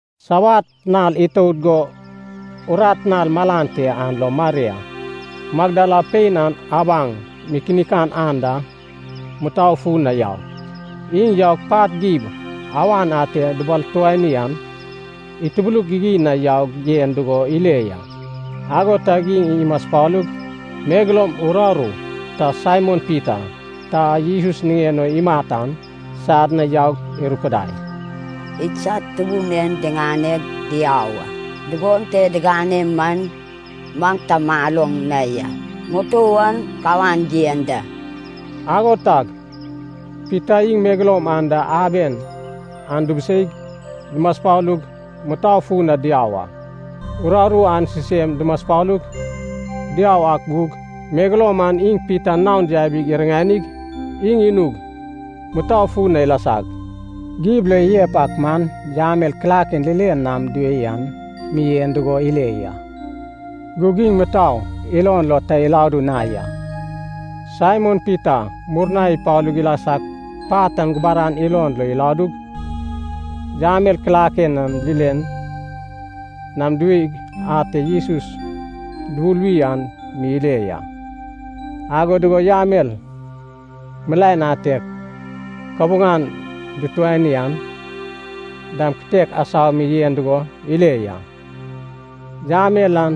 Sabat nal itout go urat nal malan te an lo Maria, Magdala pein an abaŋ mikinik anda mutou fun na yau. Iŋ yaug pat gib awan ate dubalfutani an, itubuluk gigin na yaug yen dugo ile ya. Ago tag iŋ imaspalug, megeloum uraru, ta Saimon Pita, ta a Jesus niŋen o imat an, sad na yaug irupudai, “Idsad Tubun en diŋaneg diau a. Dugon te digane man maŋ ta maloŋ na ya, mutou an kawan yen da.” Ago tag Pita iŋ megeloum an da aben an dubuseig, dumaspalug, mutou fun na diau a. Uraru an sisem dumaspalug, diau ak gug, megeloum an iŋ Pita naon yabi iriŋanig, iŋ inug mutou fun na ilasag, gib lo iyep ak man yamel kilaken linen nam diwei an mi yen dugo ile ya. Gug iŋ mutou ilon lo ta iladu na ya. Saimon Pita murna ipalu ilasag, pat gubaran ilon lo iladug, yamel kilaken a linen nam diweig ate Jesus dubuluwi an mi ile ya. Ago dugo yamel milaen ate kabuŋan dutuani an dam kitek asau mi yen dugo ile ya. Yamel an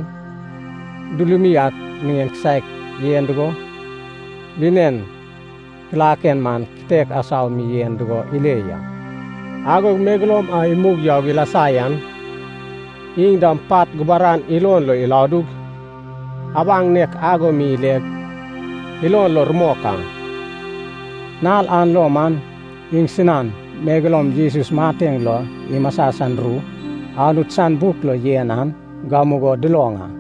dulumi ak sen kisaek yen dugo, linen kilaken man kitek asau mi yen dugo ile ya. Agog megeloum a imug yaug ilasa yan, iŋ dam pat gubaran ilon lo iladug, abaŋ nek ago mi ileg, ilon lo rumok a. Nal an lo man iŋsinan megeloum Jesus mateŋ lo imasa san ru Anut san buk lo yen an gamugo duloŋ a.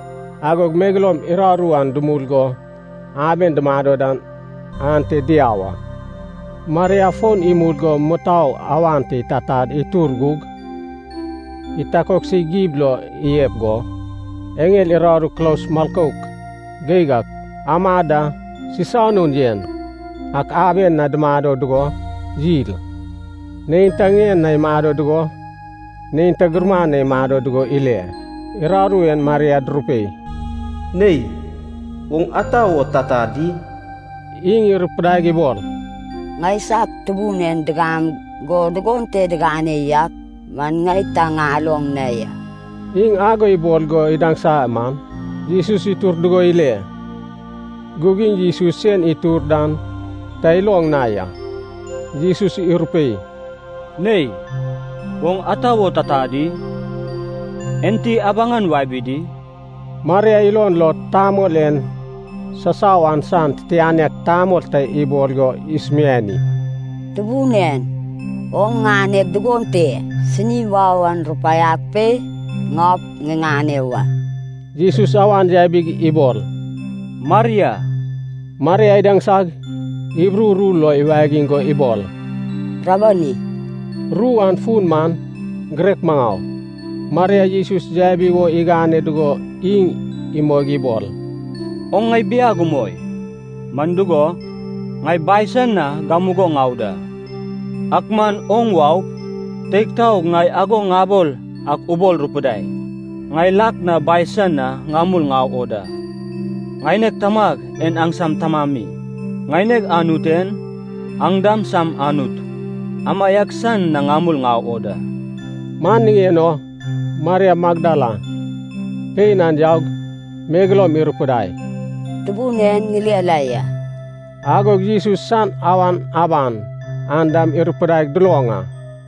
Agog megeloum uraru an dumul go aben dumado dan ante diau a. Maria fon imul go mutou awan te itatad itur gug, itakoksig gib lo iyep go, eŋel uraru kulos milkouk geig ak amad da sisanun yen ak aben na dumado dugo yil. Neinta ŋien na imado dugo, neinta gumuran na imado dugo ile. Uraru en Maria durupei, “Nei, oŋ ata wo tata di?” Iŋ irupidaig ibol, “Ŋaisag Tubun en digam go dugon te digane yak man ŋai ta ŋaloŋ na ya.” Iŋ ago ibol go idaŋsa man, Jesus itur dugo ile. Gug iŋ Jesus sen itur dan ta iloŋ na ya. Jesus irupei, “Nei, oŋ ata wo tata di? Enti abaŋan wabi di?” Maria ilon lo tamol en sasau an san titianek tamol ta ibol go isumiani, “Tubun en, oŋ ŋaneg dugon te sini wau an, rupaiag pe, ŋaup ŋiŋane wa.” Jesus awan yabig ibol, “Maria.” Maria idaŋsag, Hibru ru lo iwagiŋ go ibol, “Rabboni!” (Ru an fun man: girek maŋau.) Maria Jesus yabi wo igane dugo iŋ imoig ibol, “Oŋ ŋai biag umoi, man dugo, ŋai Bai san na gamugo ŋau da. Ak man oŋ waup, teig taog ŋai ago ŋabol ak ubol rupudai, ‘Ŋai lak na Bai san na ŋamul ŋau o da. Ŋaineg Tamag en aŋsam Tamami, ŋaineg Anut en, aŋ dam sam Anut, amaiak san na ŋamul ŋau o da.’” Man niŋen o Maria Magdala pein an yaug, megeloum irupudai, “Tubun en ŋile la ya!” Agog Jesus san awan aban an dam irupudaig duloŋ a.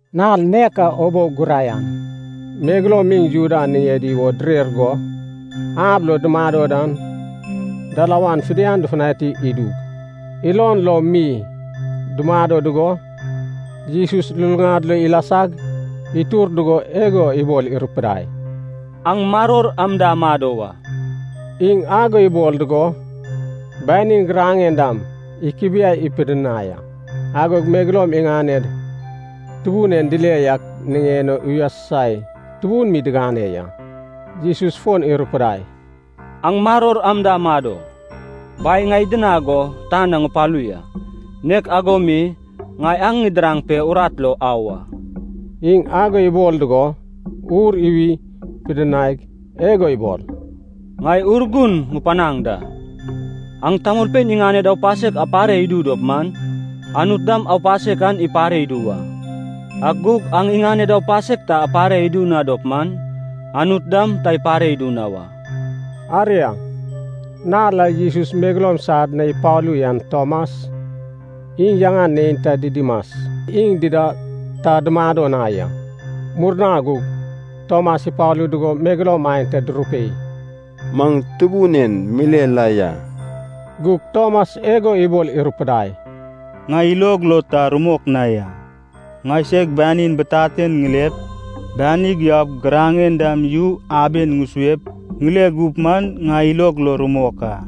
Nal nek a ubou guraian megeloum iŋ Juda niŋedi wo direr go, ab lo dumado dan dalawan fidian dufutanai idug, ilon lo mi dumado dugo, Jesus luluŋad lo ilasag, itur dugo igo ibol irupudai, “Aŋ maror am da amado wa.” Iŋ ago ibol dugo, banin giraŋen dam ikubiai pidinai a. Agog megeloum iŋaned Tubun en dile yak niŋen o uyasusai tubun mi digane ya. Jesus fon irupudai, “Aŋ maror am da amado! Bai ŋai idinag go tan na ŋupalu ya, nek ago mi ŋai aŋ ŋidiraŋ pe, urat lo au a.” Iŋ ago ibol dugo, ur iwi pidinaig, igo ibol, “Ŋai Urgun ŋupanaŋ da. Aŋ tamolpein iŋaned aupasek apare idu dop man, Anut dam aupasek an ipare idu wa. Ak gug aŋ iŋaned aupasek ta apare idu na dop man, Anut dam ta ipare idu na wa.” Aria, nal a Jesus megeloum sad na ipalu yan Tomas, iŋ yaŋan neinta Didimas, iŋ dida ta dumado na ya. Murna gug Tomas ipalu dugo megeloum aenta durupei, “Maŋ Tubun en mile la ya.” Gug Tomas igo ibol irupudai, “Ŋai ilog lo ta rumok na ya. Ŋaiseg banin bitaten ŋilep, banig yaup, giraŋen dam yu aben ŋusuep ŋile gup man, ŋai ilog lo rumok a.”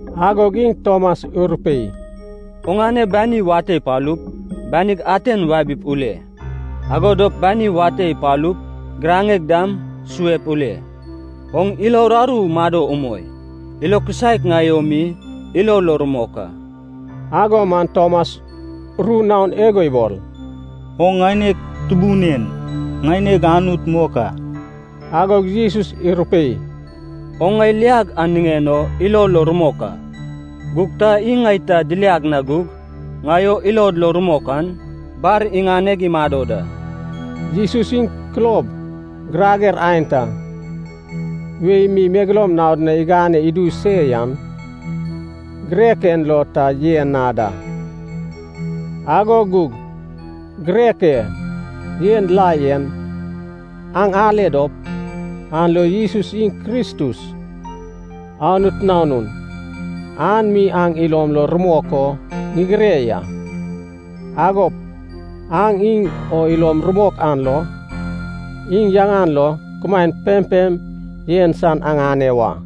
Agog iŋ Tomas irupei, “Oŋane bani wate ipalup, banig aten wabi ule. Ago dop bani wate ipalup giraŋeg dam suep ule. Oŋ ilo uraru mado umoi. Ilo kisaek ŋai o mi ilo lo rumok a.” Ago man Tomas ru naon igo ibol, “Oŋ ŋaineg Tubun en, ŋaineg Anut mok a!” Agog Jesus irupei, “Oŋ ŋai liag an niŋen o ilo lo rumok a. Gug ta iŋ ŋai ta diliag na gug, ŋai o ilod lo rumok an, bar iŋaneg imado da.” Jesus iŋ kulob girager aenta wei mi megeloum naod na igane idu se yan, girek en lo ta yen na da. Ago gug girek e yen la yen aŋ ale dop, an lo Jesus iŋ Kristus, Anut Nanun, an mi aŋ ilom lo rumok o ŋigire ya. Agop aŋ iŋ o ilom rumok an lo, iŋ yaŋan lo kumaen pempem yen san aŋane wa.